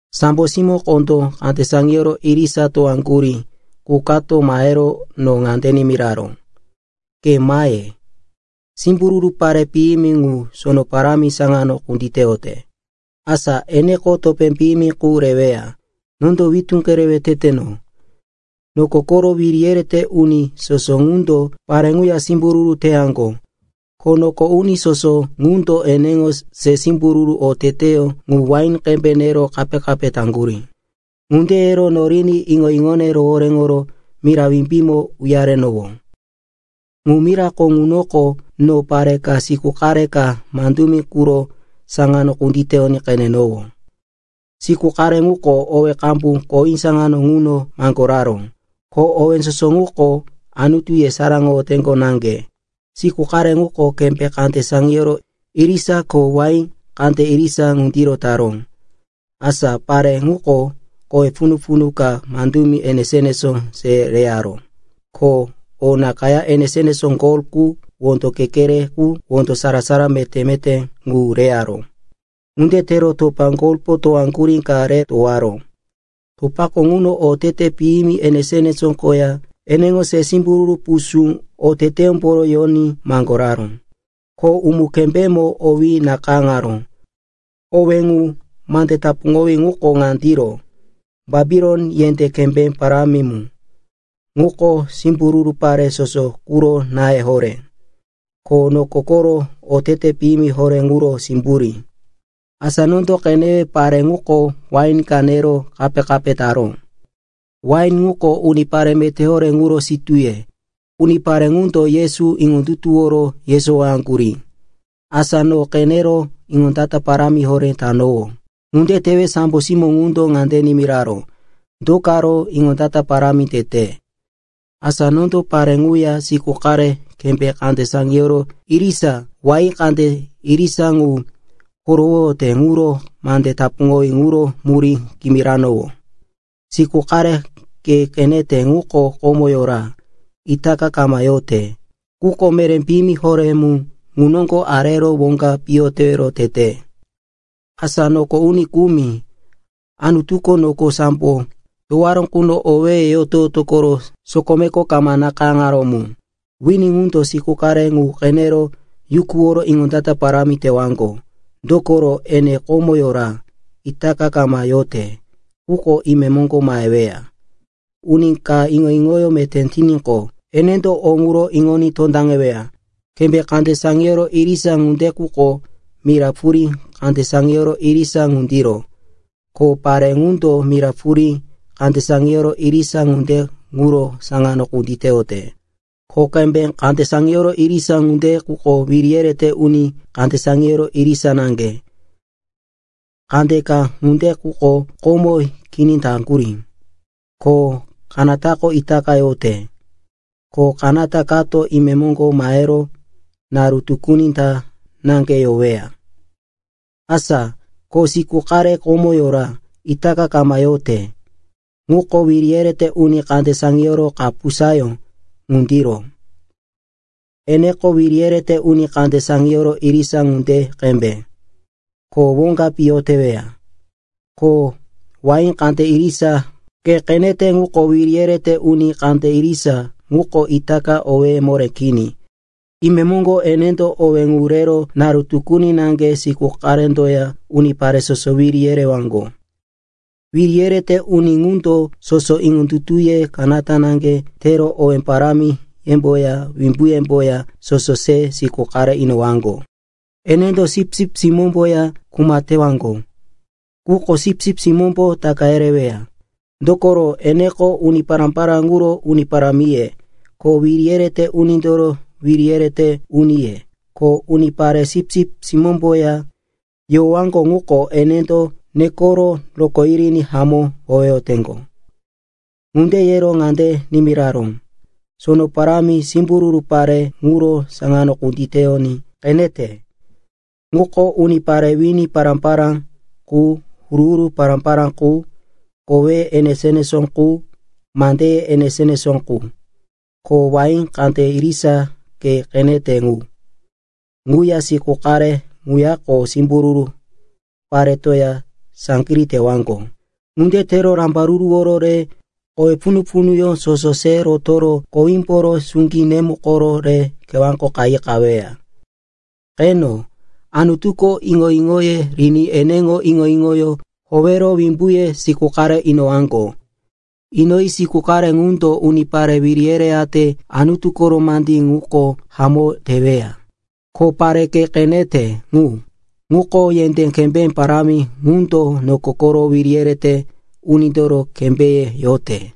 Sambo simó kondó kande saŋiyoro irisa towaŋgurí qu kato mahero no ŋande nimiraró, “Ke mahe! Simbururu pare piyimi ŋu sono parámi saŋano kunditeyote, asa eneko topé piyimi qu reweya. Nondo witú kerewe teteno. Noko koro wiri yerete uni soso ŋundo pare ŋuya simbururu teyaŋgo. Ko noko uni soso ŋundo eneŋo se simbururu oteteyó ŋu wain qembe nero kape-kape taŋgurí.” Ŋunde yero noriní iŋo-iŋone rohoréŋoro mira wimbímo uyarenowó. Ŋu mirako ŋunoko no pare ka siku qare ka mandumi quro saŋano kunditeyoní qenenowó. Siku qare ŋuko owé qambu kowí saŋano ŋuno maŋgoraró, ko owé soso ŋuko Anutu yesaráŋoyoteŋgo naŋge. Siku qare ŋuko kembé kande saŋiyoro irisa ko wahí kande irisa ŋundiro taró. Asa pare ŋuko kowe punu-punu ka mandumi enesó-enesó se reyaró, ko o nakayá enesó-enesó gol qu, wondo kekere qu, wondo sara-sara meté-meté ŋu reyaró. Ŋunde tero topa golpo towaŋgurí ka re towaró. Topako ŋuno otete piyimi enesó-enesó koya eneŋo se simbururu pusú oteteyómbo yoní maŋgoraró. Ko umu-kembémo owí nakayáŋaró. Owé ŋu, mande tapuŋowí ŋuko ŋandiro, “Bapilon, yendé kembé parámi mu, ŋuko simbururu pare soso quro náye horé, ko noko koro otete piyimi horé ŋuro simburí.” Asa nondo qenewe pare ŋuko wain ka nero kape-kape taró. Wain ŋuko unipare meté horé ŋuro sitúye. Unipare ŋundo Yesu iŋondutuworo yesowaŋgurí. Asa no qenero iŋondata parámi horé tanowó. Ŋunde tewe sambo simó ŋundo ŋande nimiraró, “Do karo iŋondata parámi tete? Asa nondo pare ŋuya siku qare kembé kande saŋiyoro irisa, wahí kande irisa ŋu korowoyote ŋuro mande tapuŋowí ŋuro murí kimirowano. Siku qare ke qenete ŋuko komo yora, itaka kama yote, quko meré piyimi horé mu ŋu noŋgo arero woŋga piyo tewero tete. Asa noko uni kumi, Anutuko noko sambo towaró quno owéye yoto-yoto koro sokomeko kama nakayáŋaró mu, wini ŋundo siku qare ŋu qenero yukuworo iŋondata parámi tewaŋgo. Dokoro ene komo yora, itaka kama yote, quko imemoŋgo maheweya. “Uni ka iŋo-iŋoyó meté tiníqo, enendo o ŋuro iŋoní tondaŋeweya. Kembé kande saŋiyoro irisa ŋunde quko mira purí kande saŋiyoro irisa ŋundiro, ko pare ŋundo mira purí kande saŋiyoro irisa ŋunde ŋuro saŋano kunditeyote. Ko kembé kande saŋiyoro irisa ŋunde quko wiri yerete uni kande saŋiyoro irisa naŋge. Kandeka ŋunde quko komo kini taŋgurí, ko kanatako itaka yote, ko kanata kato imemoŋgo mahero naru tukuni ta naŋge yoweya. Asa ko siku qare komo yora, itaka kama yote, ŋuko wiri yerete uni kande saŋiyoro kapusayó ŋundiro. Eneko wiri yerete uni kande saŋiyoro irisa ŋunde qembe, ko woŋga piyo teweya. “Ko wahí kande irisa ke qenete ŋuko wiri yerete uni kande irisa quko itaka owéye moré kini. Imemoŋgo enendo owé ŋu rero naru tukuni naŋge siku qarendoya unipare soso wiri yerewaŋgo. Wiri yerete uni ŋundo soso iŋondutuye kanata naŋge tero owé parámiyemboya wimbuyemboya soso se siku qare inowaŋgo. Enendo Sipsip Simómboya kuma tewaŋgo. Quko Sipsip Simómbo taka yereweya, dokoro eneko uni pará-pará ŋuro uni parámiye, ko wiri yerete unindoro wiri yerete uniye. Ko unipare Sipsip Simómboya yowaŋgo ŋuko enendo nekoro rokó yiriní hamó howeyoteŋgo.” Ŋunde yero ŋande nimiraró, “Sono parámi simbururu pare ŋuro saŋano kunditeyoní qenete. Ŋuko unipare wini pará-pará qu, huru-huru pará-pará qu, koweye enesó-enesó qu, mandeye enesó-enesó qu. Ko wahí kande irisa ke qenete ŋu, ŋuya siku qare ŋuyako simbururu paretoya saŋgirí tewaŋgo. Ŋunde tero rambaruruworo re kowe punu-punuyó soso se rotoro kowímboro suŋgí nemukoro re kewáko qayi qaweya. Qeno, Anutuko iŋo-iŋoye riní eneŋo iŋo-iŋoyó howero wimbuye siku qare inowaŋgo. Inoyi siku qare ŋundo unipare wiri yereyate Anutu koro mandí ŋuko hamó teweya. Ko pare ke qenete ŋu, ŋuko yendé kembé parámi ŋundo noko koro wiri yerete unindoro kembéye yote.”